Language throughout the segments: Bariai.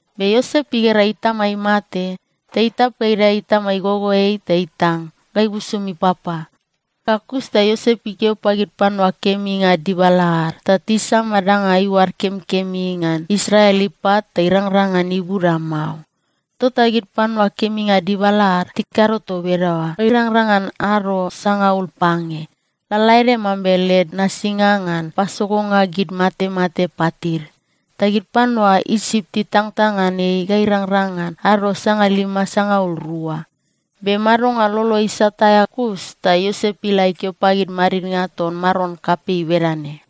Be Iosep igera itama imate, ta itap ga idae itama igogoeai ta itang ga ibusum ipapa. Ga kus ta Iosep ikeo pagid panua keminga dibala ad, ta tisama danga iuad kemikemi ngan Israel ipat ta irangrang ngan ibuda mao. Tota gid panua keminga dibala ad tikado toa bedaoa ga irangrang ngan ado sangaul pange, lalaede mambe led nasinga ngan pasogonga gid matemate patid. Ta gid panua Isip titangtang ngan ei ga irangrang ngan ado sangalima sangaul rua. Be madonga lolo isat aea kus ta Iosep ila ikeo pagid madidnga ton maron kapei bedane,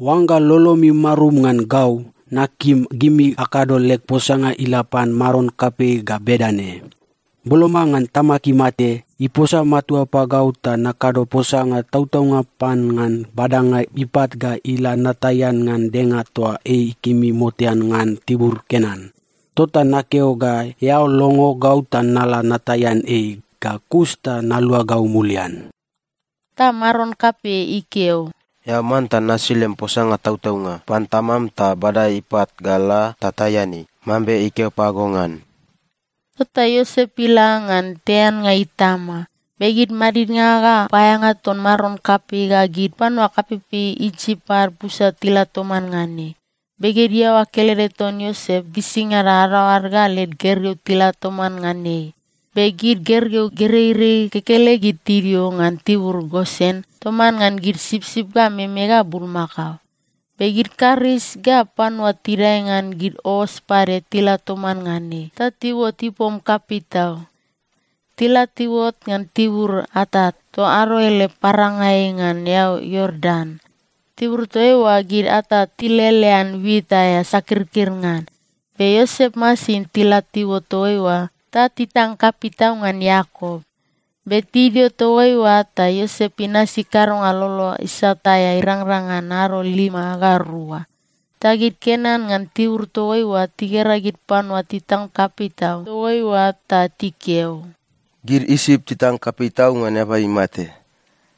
“Oangga lolomi marum ngan gau, nakim gimi akado leg posanga ila pan maron kapei ga bedane, ‘Boloma ngan tamag imate, iposa matua pagau ta nakado posanga tautaunga pan ngan badanga ipat ga ila nataian ngan denga toa ei ikemi motean ngan tibur Kenan. Tota nakeo ga eao longo gau ta nala nataian ei, ga kus ta naluagau mulian.’” Ta maron kapei ikeo, “Eao manta nasi lem posanga tautaunga pan tamam ta bada ipat ga ila ta taian ei, mambe ikeo pago ngan.” Tota Iosep ila ngan taiannga itama. Be gid madidnga ga paeaeanga ton maron kapei ga gid panua kapeipei Isip ad busa tila toman ngan ei. Be gid iaoa kelede ton Iosep gisingada adadaoad ga led gergeu tila toman ngan ei. Be gid gergeu gereirei kekelegid tidio ngan tibur Gosen toman ngan gid sipsip ga meme ga bulmakao. Be gid karis ga panua tidae ngan gid os pade tila toman ngan ei. Ta tiuot ipom kapei tau. Tila tiuot ngan tibur Atat, toa ado ele parangai ngan eau Iordan. Tibur toa oa gid Atat tilelean wit aea sakirkir ngan. Be Iosep masin tila tiuot toa eoa ta titang kapei tau ngan Iakop. Be tidio toa eoa ta Iosep inasi kadonga lolo isat aea irangrang ngan ado lima ga rua. Ta gid Kenan ngan tibur toa oa tigera gid panua titang kapei tau toa eoa ta tikeo, “Gid Isip titang kapei tau ngan eaba imate.”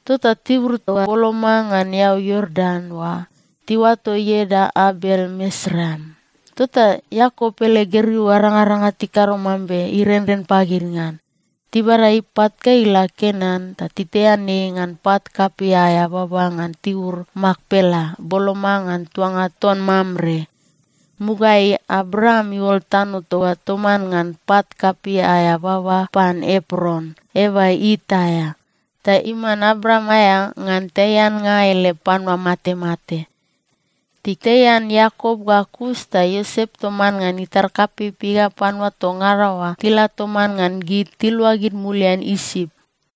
Tota tibur toa boloma ngan eau Iordan oa, tiuato ieda Abel-Misraim. Tota Iakop ele gergeu arangaranga tikado mambe irenren pagid ngan. Tibada ipat ga ila Kenan, ta titaian ei ngan pat kapei aea baba ngan tibur Makpela boloma ngan tuanga ton Mamre. Mugaeai Abraam iuol tano toa oa toman ngan pat kapei aea baba pan Epron, eaba It aea, ta iman Abraam aea ngan taiannga ele panua matemate. Titaian Iakop ga kus ta Iosep toman ngan itar kapeipei ga panua toa ngada oa tila toman ngan gid, tiluagid mulian Isip.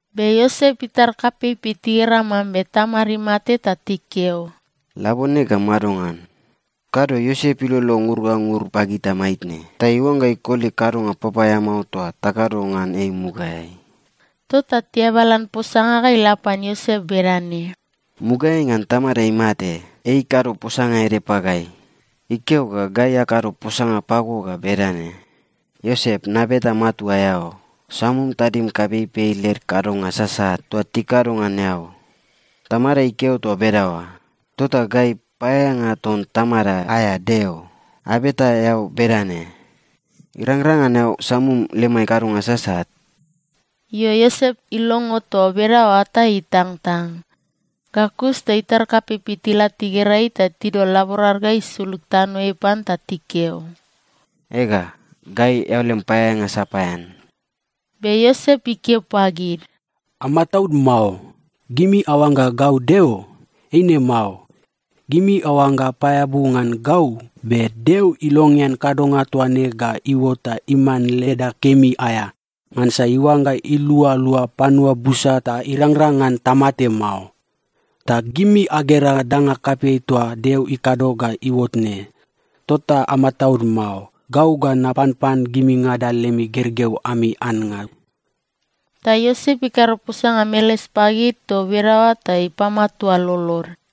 Be Iosep itar kapeipei tigera mambe tamad imate ta tikeo, “Labone gau madongan? Kado Iosep ilolo ngur ga ngur pagita maitne ta iuangga ikoli kadonga papaeamao toa takado ngan ei mugaeai.” Tota tiabalan posanga ga ila pan Iosep bedane, “Mugaeai ngan tamada imate, ei ikado posanga ede pagai. Ikeo ga gai akado posanga pago ga bedane, ‘Iosep, nabeta matua eao, samum tadim kapeipei led kadonga sasat toa tikado ngan eao.’ Tamada ikeo toa bedaoa, tota gai, paeaeanga ton tamada aea Deo, abeta eao bedane: Irangrang ngan eao samum lemai kadonga sasat?” Io, Iosep ilongo toa bedaoa ta itangtang. Ga kus ta itar kapeipei tila tigera ei ta tidol laborad ga isulug tanoeai pan ta tikeo, “Ega, gai eao lem paeaeanga sapaean.” Be Iosep ikeo pagid, “Amataud mao. Gimi aoangga gau Deo? Eine mao. Gimi aoangga apaeabu ngan gau, be Deo ilongean kadonga toa ne ga iuot ta iman leda kemi aea, ngansa iuangga ilualua panua busa ta irangrang ngan tamate mao. Ta gimi agera danga kapei toa Deo ikado ga iuot ne. Tota amataud mao. Gau ga napanpan gimingada lemi gergeu ami annga.” Ta Iosep ikado posanga meles pagid toa bedaoa ta ipamatua lolod.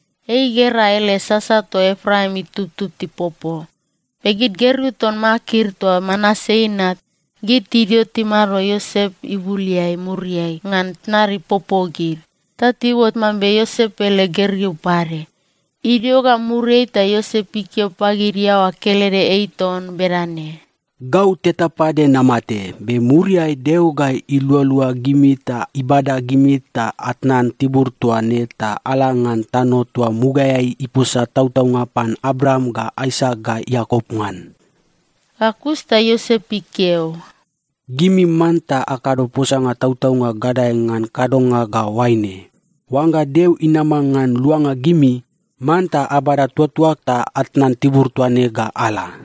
Ei igera ele sasa toa Epraim itubtub tipopo. Be gid gergeu ton Makir toa Manase inat, gid tidio timado Iosep ibuleai muriai ngan tnad ipopo gid. Ta tiuot mambe Iosep ele gergeu pade. Idio ga muriai ta Iosep ikeo pagid iaoa kelede ei ton bedane, “Gau teta pade namate. Be muriai Deo ga ilualua gimi ta ibada gimi ta atnan tibur toa ne ta ala ngan tano toa mugaeai iposa tautaunga pan Abraam ga Aisak ga Iakop ngan.” Ga kus ta Iosep ikeo, “Gimi manta akado posanga tautaunga gadae ngan kadonga ga oaine: Oangga Deo inama ngan luanga gimi, manta abada tuatuag ta atnan tibur toa ne ga ala.”